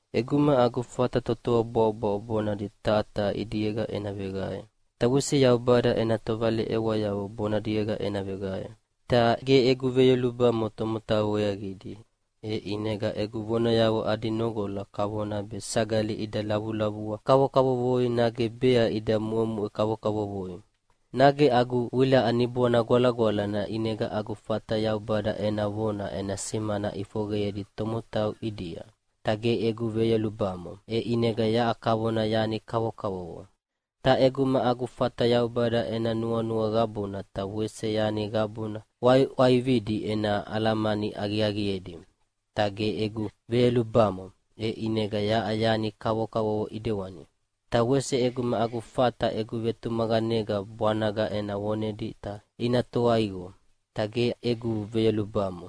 ʼEguma agu fata totoa bwaʼobwaʼo bonadi taha taha ʼidiega ena veqae, ta wese Yaubada ena tovaleʼewayavo bonadiega ena veqae, ta ge egu veyolubamo tomotau weaqidi, e ʼinega egu vonayavo adi noqola kavona be sagali ida lavulavua kavokavovoi nage bea ida muʼemuʼe kavokavovoi. Nage agu wilaʼa Niboana Gwalagwalana ʼinega agu fata Yaubada ena vona ena simana ʼifoqeyedi tomotau ʼidia, ta ge egu veyolubamo, e ʼinega yaʼa kavona yani kavokavovo. Ta ʼeguma agu fata Yaubada ena nuanua qabuna ta wese yani qabuna ʼwaiʼwaividi ena alamani aqiaqiedi, ta ge egu veyolubamo, e ʼinega yaʼa yani kavokavovo ʼidewani. Ta wese ʼeguma agu fata egu vetumaqanega bwanaga ena vonedi ta ina toa iqo, ta ge egu veyolubamo,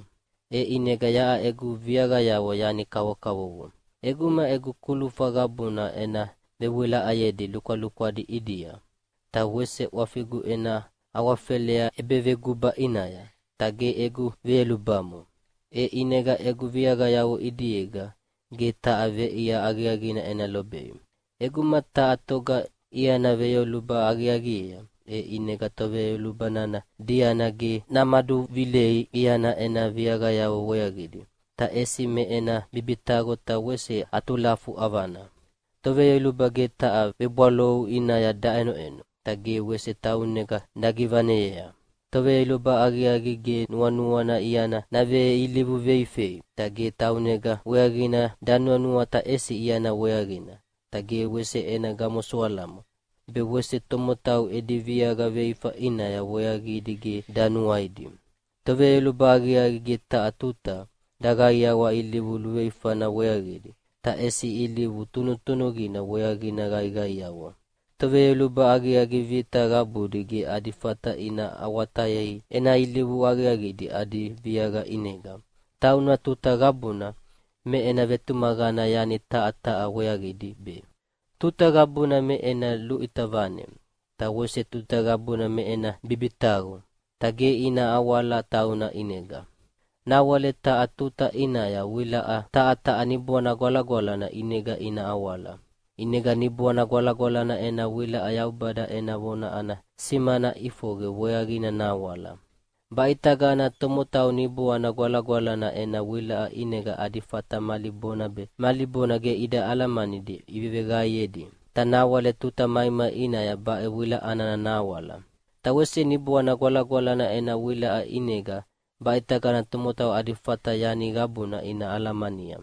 e ʼinega yaʼa egu viaqayavo yani kavokavovo. ʼEguma egu kulufa qabuna ena vewilaʼayedi lukwalukwadi ʼidia, ta wese ʼwafigu ena awafelea ʼebeveguba ʼinaya, ta ge egu veyolubamo, e ʼinega egu viaqayavo ʼidiega ge taha veʼia aqiaqina ena lobei. ʼEguma taha toga iana veyoluba aqiaqiea, e ʼinega toveyoluba nana diana ge namaduvilei iana ena viaqayavo weaqidi, ta ʼesi me ena bibitaqo ta wese atulafu ʼavana. Toveyoluba ge taha vebwalaou ʼinaya daʼenoʼeno, ta ge wese taunega dagivaneyea. Toveyoluba aqiaqi ge nuanuana iana naveilivu veifei, ta ge taunega weaqina danuanua ta ʼesi iana weaqina, ta ge wese ena gamosoalamo, be wese tomotau edi viaqa veifa ʼinaya weaqidi ge danuaidi. Toveyoluba aqiaqi ge taha tuta daqaiawa ilivu luveifana weaqidi, ta ʼesi ilivu tunutunuqina weaqidi qaiqaiawa. Toveyoluba aqiaqi vita qabudi ge adi fata ina awatayei ena ilivu aqiaqidi adi viaqa ʼinega. Tauna tuta qabuna me ena vetumaqana yani taha taha weaqidi be, tuta qabuna me ena luʼita vane, ta wese tuta qabuna me ena bibitaqo, ta ge ina awala tauna ʼinega. Nawale taha tuta ʼinaya wilaʼa taha taha Niboana Gwalagwalana ʼinega ina awala. ʼInega Niboana Gwalagwalana ena wilaʼa Yaubada ena vona ana simana ʼifoqe weaqina nahawala. Baʼitagana tomotau Niboana Gwalagwalana ena wilaʼa ʼinega adi fata mali bona be mali bona ge ida alamanidi iveveqaeyedi, ta nawale tuta maimai ʼinaya baʼe wilaʼa nana nahawala. Ta wese Niboana Gwalagwalana ena wilaʼa ʼinega baʼitagana tomotau adi fata yani qabuna ina alamania,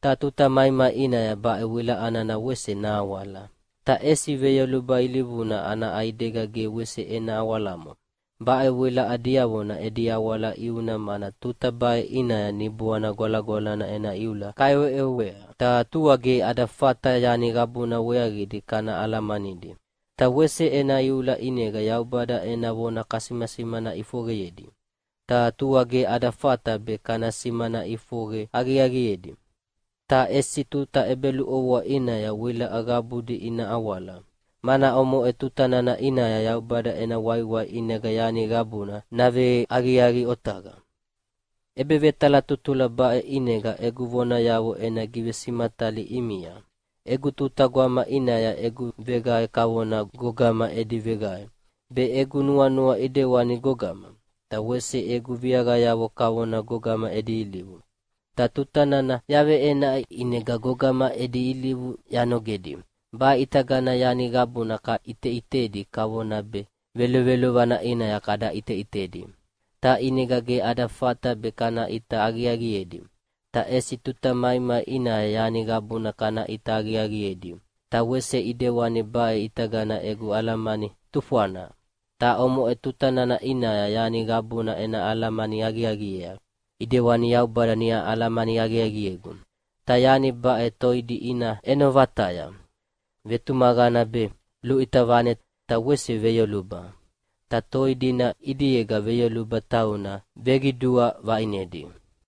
ta tuta maimai ʼinaya baʼe wilaʼa nana wese nahawala. Ta ʼesi veyoluba ilivuna ana ʼaidega ge wese ena awalamo. Baʼe wilaʼa diavona edi awala ʼiuna mana tuta baʼe ʼinaya Niboana Gwalagwalana ena iula kaʼeweʼewea, ta tua ge ada fata yani qabuna weaqidi kana alamanidi. Ta wese ena iula ʼinega Yaubada ena vona kasimasimana ʼifoqeyedi, ta tua ge ada fata be kana simana ʼifoqe aqiaqiedi. Ta ʼesi tuta ʼebeluʼovoa ʼinaya wilaʼa qabudi ina awala, mana omoʼe tuta nana ʼinaya Yaubada ena waiwai ʼinega yani qabuna naveaqiaqi otaqa. ʼEbevetalatutula baʼe ʼinega egu vonayavo ena givesimatalia ʼimia. Egu tuta gwama ʼinaya egu veqae kavona gogama edi veqae, be egu nuanua ʼidewani gogama, ta wese egu viaqayavo kavona gogama edi ilivu. Ta tuta nana yaveʼenaʼi ʼinega gogama edi ilivu yanogedi. Baʼe ʼitagana yani qabuna kaʼiteʼitedi kavona be velovelovana ʼinaya kada ʼiteʼitedi, ta ʼinega ge ada fata be kana ʼita aqiaqiedi, ta ʼesi tuta maimai ʼinaya yani qabuna kana ʼita aqiaqiedi. Ta wese ʼidewani baʼe ʼitagana egu alamani tufwana, ta omoʼe tuta nana ʼinaya yani qabuna ena alamani aqiaqiea, ʼidewani Yaubada niʼa alamani aqiaqiegu. Ta yani baʼe toidi ina ʼeno vataya: Vetumaqana be, luʼita vane ta wese veyoluba. Ta toi dina ʼidiega veyoluba tauna veqidua vaʼinedi.